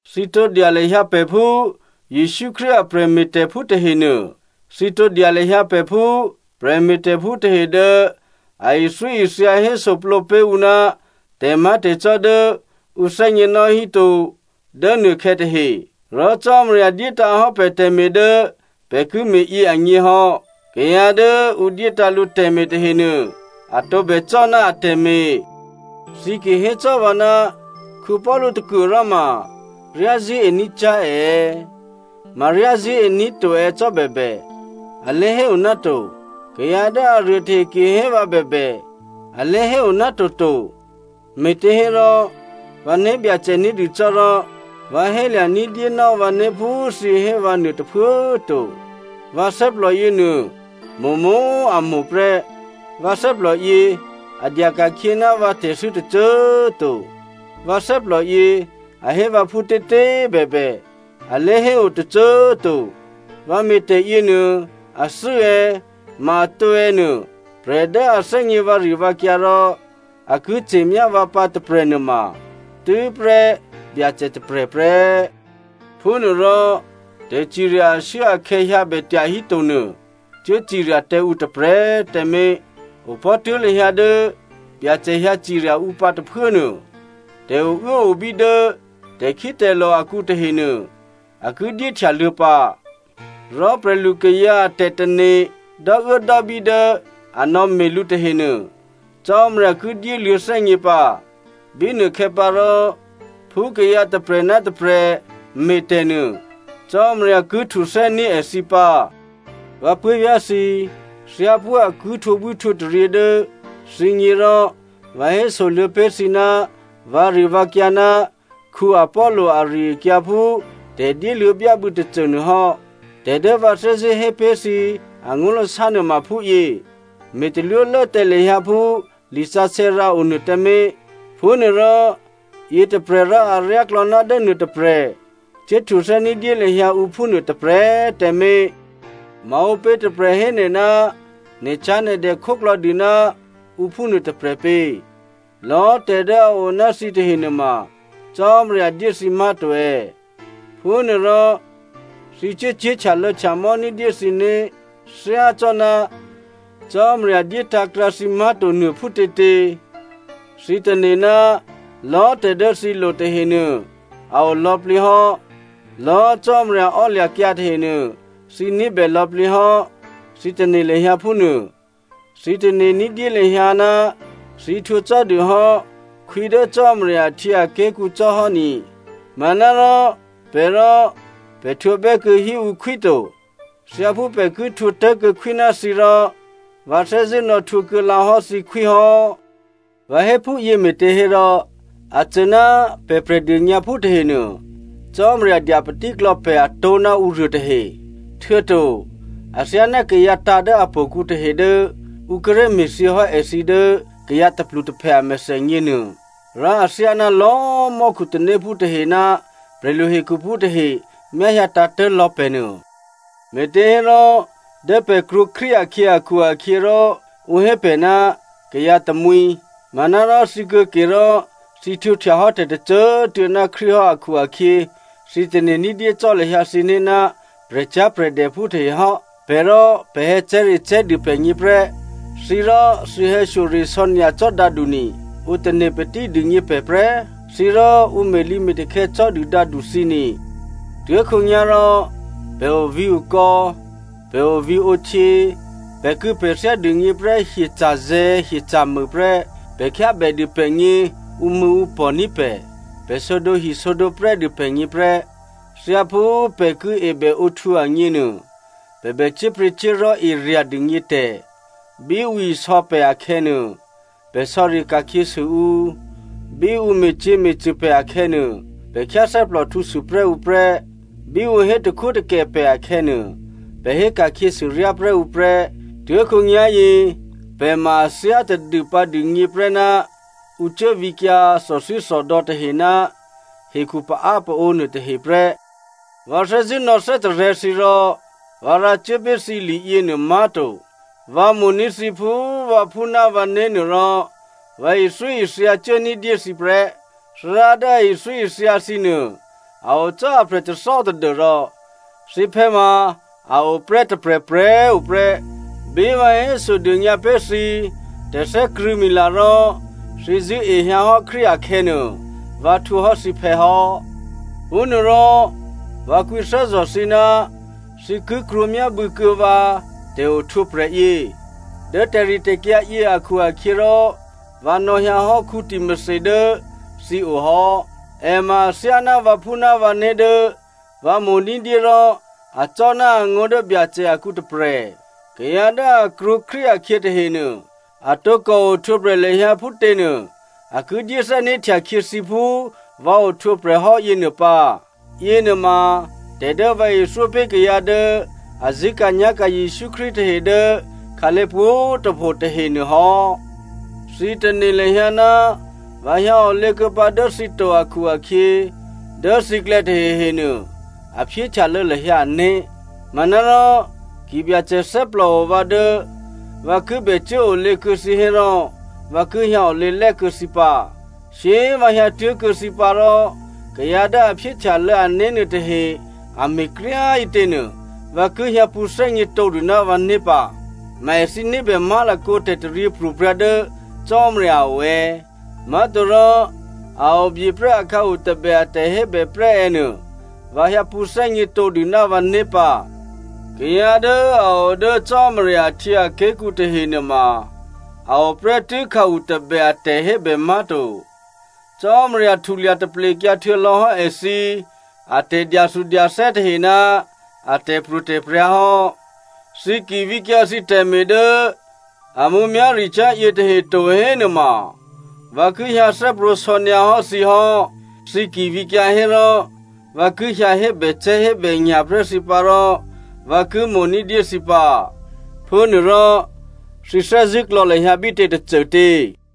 Thǐ tǒ dya lahyǎ pè̤ phú Jesǔ Krístu a prè̤me̤tè̤phú tahenuô. Thǐ tǒ dya lahyǎ pè̤ phú prè̤me̤tè̤phú tahe dố a ithyóithya hésoplǒ pé̤ ǔ ná tè̤má̤tè̤cò́ dố ǔ thè́gněnò́ híto dố nuôkhè̌ tahe. Rò Cò́marya dyétǎ̤hò́ pè̤ tè̤me̤ dố pè̤ ki me̤ yě agně hò́. Kayǎ dố ǔ dyétǎ̤ lǔ tè̤me̤ tahenuô, a tǒbè cò́ ná atè̤me̤. Thǐ ki hécò́ vǎ ná Paulu tôkuôròma ryázṳ̂́e ní̤cyá̤ è è̌, ma ryá zṳ̂́ení̤ to è̌ cò́ bèbè, a lé̤héo náto. Kayǎ dố aruô tahe ki hé vǎ bèbè, a lé̤héo nátoto, me̤těhérò vǎ né̤byacè ní̤dû cò́ rò vǎ hélya̤ ní̤dyénò́ vǎné̤ phú thǐ hé vǎ nuô tôphuố꤮ to. Vǎ thè́plò yěnuô mo̤mo̤ a mo̤ prè́, vǎ thè́plò yě a dya ka̤khyě ná vǎ tè̤thû́ tôcô꤮ to. Vǎ thè́plò yě a hé vǎ phútětě꤮ bèbè, alé̤hé o tôcô꤮ to. Vǎ me̤tè̤ yěnuô athû́ è̌, ma atǒ è̌ nuô, prè̤ dố a thè́gně vǎrivǎkyǎ rò a ki ce̤myá vǎ pǎ tôprè̤nuôma tû́prè́ Byacè tôprè̤ prè́. Phúnuôrò tè̤cirya ashuốakhè̌ hyǎ bè tyahíto nuô, cuố cirya tǎ ǔ tôprè̤꤮ tǎmé̤. Opò̤́ tuố̤ lahyǎ dố Byacè hyǎ cirya ǔ pǎ tôphuố nuô. Tè̤ouốobí dố tè̤khítè̤lò̤ akǔ tahenuô, a ki dyéhtyaluô̌ pǎ. Rò prè̤lukayǎ a tè̤tane̤ dò́uốdò́bí dố a nò̌me̤ lǔ tahenuô, Cò́marya ki dyéluô̌ thè́gně pǎ. Bínuôkhè̌ pǎ rò, phú kayǎ tôprè̤ ná tôprè̤ me̤ tè̤ nuô, Cò́marya ki htuthè́ní̤ èthǐ pǎ. Vǎ puố̤vyá̤ thǐ, thyáphú a ki htwǒbwíhtwǒtaryě dố thǐgně rò vǎ hésoluô̌ pé̤ thǐ ná vǎrivǎkyǎ ná Apollo ari-akyǎ phú tè̤ dyéluô̌byábû̌ tôcô nuô hò́. Tè̤ dố vǎ thè́zṳ̂́ hé pé̤ thǐ angó̤lasá nuôma phúyě: “Me̤ talwólố tǎ lahyǎ phú lisǎsè̌ rǎ o nuô tǎmé̤.” Phúnuôrò yětôprè̤ rò aryáklò̌ ná dố nuôtôprè̤, cuố htuthè́ ní̤dyé lahyǎ ǔ phúnuô tôprè̤꤮ tǎmé̤. Maǔpě tôprè̤ hé nè̤ ná nè̤cyá̤nè̤dè khóklò̌ dû ná ǔ phúnuô tôprè̤ pě? Lò̌꤮ tè̤ dố a o ná thǐtahe nuôma Cò́marya dyé thǐ má̤to è̌? Phúnuôrò, thǐ cuốcyé̤ htyalô̌htyamò́ ní̤dyé thǐné̤ thyácò́ná Cò́marya dyétǎ̤ krǎ thǐ má̤to nuô phútětě? Thǐ tane̤ ná lò̌꤮ tè̤ dố thǐ lo tahenuô a o lò̌plǐ hò́, lò̌꤮ Cò́marya ò́lya̤kyǎ tahenuô thǐ ní̤bè lò̌plǐ hò́, thǐ tane̤ lahyǎ phúnuô. Thǐ tane̤ ní̤dyé lahyǎ ná thǐ htwǒ cò́dû hò́ khwí dố Cò́marya ahtyěaké̤kǔ cò́hò́ ni, manárò pè̤ rò pè̤ htwǒbè́ kuô̌ hí ǔ khwí to. Thyáphú pè̤ ki htwǒ tố̤kuô̌ khwí ná thǐ rò, vǎ thè́zṳ̂́ nò̌htwǒ kuô̌ lǎ hò́ thǐ khwí hò́. Vǎ hé phúyě me̤těhérò, a cô ná pè̤ Prè̤dônyǎphú tahenuô, Cò́marya dya patíklò̌ pè̤ a tó̤ ná ǔruô tahe. Htuô̌to athyáná kayǎ tǎ̤ dố htò̌kǔ tahe dố ǔ kíré̤ me̤thyě hò́ èthǐ dố kayǎ tôplutôphè a mèthènyě nuô. Rò athyáná lò̌꤮ mò́khu tanéphú tahe ná prè̤lu hekhuphú tahe myá hyǎ tǎ̤tố̤ lò̌ pè̤ nuô. Me̤těhérò dố pè̤ krwǒ Krístu akhyě akhu-akhyěrò ǔ hé pè̤ ná kayǎ tamwǐ. Manárò thǐ kuô̌ke rò, thǐ htwǒhtya hò́ tè̤ tôcô꤮ tuô̌ ná Krístu hò́ akhu-akhyě, thǐ tane̤ ní̤dyé cò́ lahyǎ thǐné̤ ná prè̤cyá̤prè̤dèphú tahe hò́. Pè̤ rò pè̤ hè̌cè̤́recè̤́ dû pè̤gně prè́, thǐ rò thǐ hè̌shyoresò̌ nyacò́ dǎdu꤮ ni. Ǔ tane̤ patí dûgně pè̤ prè́. Thǐ rò ǔ me̤lǐme̤takhè̌ cò́ dû dǎdu꤮ thǐ ni. Tuố̤khǒnyá̤rò pè̤ ovǐ̤okò̌, pè̤ ovǐ̤ǒhtyě, pè̤kû̌pè̤thyá dûgně prè́ hyeca̤zè̤̌ hyeca̤mû prè́. Pè̤ khyábè dû pè̤gně ǔmṳ̂̌ǔpò̤ní̤ pè̤. Pè̤ sǒdǒhi sǒdǒprè́ dû pè̤gně prè́. Thyáphú pè̤ ki ebèǒhtwǒ agněnuô, pè̤ bè cyé̤pryě̤cyé̤li̤ erya̤ dûgně tè̤. Bí ǔ isò̌ pè̤ akhè̌nuô, pè̤ sò̌ri ka̤khyěsû ǔ. Bí ǔ me̤cyě̤me̤cṳ̂ pè̤ akhè̌nuô, pè̤ khyáthè́plòhtǔ sû prè́ ǔ prè́. Bí ǔ hé takhwótakè pè̤ akhè̌nuô, pè̤ hé ka̤khyěsû ryá prè́ ǔ prè́. Tuố̤khǒnyá̤yě, pè̤ ma a thyá tadû pǎdûgně prè́ ná ǔ cuố vǐkyǎ thòthwíthòdò̌ tahe ná hekhu paápaǒ nuôtahe prè́. Vǎ thè́zṳ̂́ nò̌thè́tarè̤̌ thǐ rò vǎ rǎ cuố pé̤ thǐ li yěnuô má̤to. Vǎ mo̤ní̤ thǐ phú vǎphú ná vǎné̤ nuô rò vǎ ithyóithya cuố ní̤dyé thǐ prè́. Thárá dố a ithyóithya thǐ nuô a o cò́ aprè̤ tôthò́ tadû́rò thǐphè̌ ma a o prè́ tôprè̤prè̤꤮ tuô̌ prè́. Bí vǎ hésodônyǎ pé̤ thǐ tè̤thè́krṳ̂̌mila rò thǐ zṳ̂́ehyǎ hò́ Krístu akhè̌nuô, vǎ htwǒhò́ thǐphè̌ hò́. Phúnuôrò vǎ kwǐthè́zò̤ thǐ ná thǐ ki krwǒ myábû̌ kuô̌ vǎ tè̤ohtwǒprè̤ yě. Dố tè̤ritè̤kyǎ yě akhu-akhyěrò vǎ nò̌hyǎ hò́ Timothy dố thǐ o hò́. È ma athyáná vǎphú ná vǎné̤ dố vǎ mo̤ ní̤dyé rò acò́ ná angó̤ dố Byacè akǔ tôprè̤. Kayǎ dố a krwǒ Krístu akhyě tahenuô, a tǒkò ohtwǒprè̤ lahyǎ phútěnuô, a ki dyé thè́né̤htya khyě thǐ phú vǎ ohtwǒprè̤ hò́ yěnuô pǎ. Yěnuôma tè̤ dố vǎ ithyó pé̤ kayǎ dố a zṳ̂́ka̤nyá̤ka̤ Jesǔ Krístu tahe dố khǎlé̤ pwǒ̤꤮ tôpho tahenuô hò́. Thǐ tane̤ lahyǎ ná vǎ hyǎ olě kuô̌ pǎ dố thǐ to akhu-akhyě, dố thǐklè̌ tahehenuô a phyéhtyalô̌ lahyǎ ané̤. Manárò ki Byacè thè́plòo vǎ dố vǎ ki bè cuốolě kuô̌ thǐ hérò vǎ ki hyǎ olě lè̤́ kuô̌ thǐ pǎ. Shyé꤮ vǎ hyǎtuố̤kuô̌ thǐ pǎ rò, kayǎ dố a phyéhtyalô̌ ané̤ nuôtahe a me̤kryá꤮ ǐtěnuô vǎ ki hyǎ pṳ̌thè́gně tǒdû ná vǎné̤ pǎ. Ma èthǐ ní̤bè má̤lakǒ tè̤taryěpro̤prya̤ dố Cò́marya a o è̌, má̤torò a o byeprè́ akhǎu tabè a tè̤hébè prè́ è̌ nuô vǎ hyǎ pṳ̌thè́gně tǒdû ná vǎné̤ pǎ. Kayǎ dố a o dố Cò́marya ahtyěaké̤kǔ tahenuôma, a o prè́tû́ khǎu tôbè a tè̤hébè má̤to. Cò́marya htulya taplekyǎ htuô̌lò̌hò́ èthǐ atè̤dyathudyathè́ tahe ná a tè̤pro̤tè̤prya̤ hò́. Thǐ ki vǐkyǎ thǐ tè̤me̤ dố a mǔmyá̤ricyá̤ yětahe to hénuôma, vǎ ki hyǎthè́prwǒ̤ sò̌ nyǎ hò́ thǐ hò́. Thǐ ki vǐkyǎ hérò vǎ ki hyǎ hébècè̤́hébènya̤ prè́ thǐ pǎ rò vǎ ki mo̤ ní̤dyé thǐ pǎ. Phúnuôrò, thǐ thè́zṳ̂́ klò̌ lahyǎ bítě tôcôtě?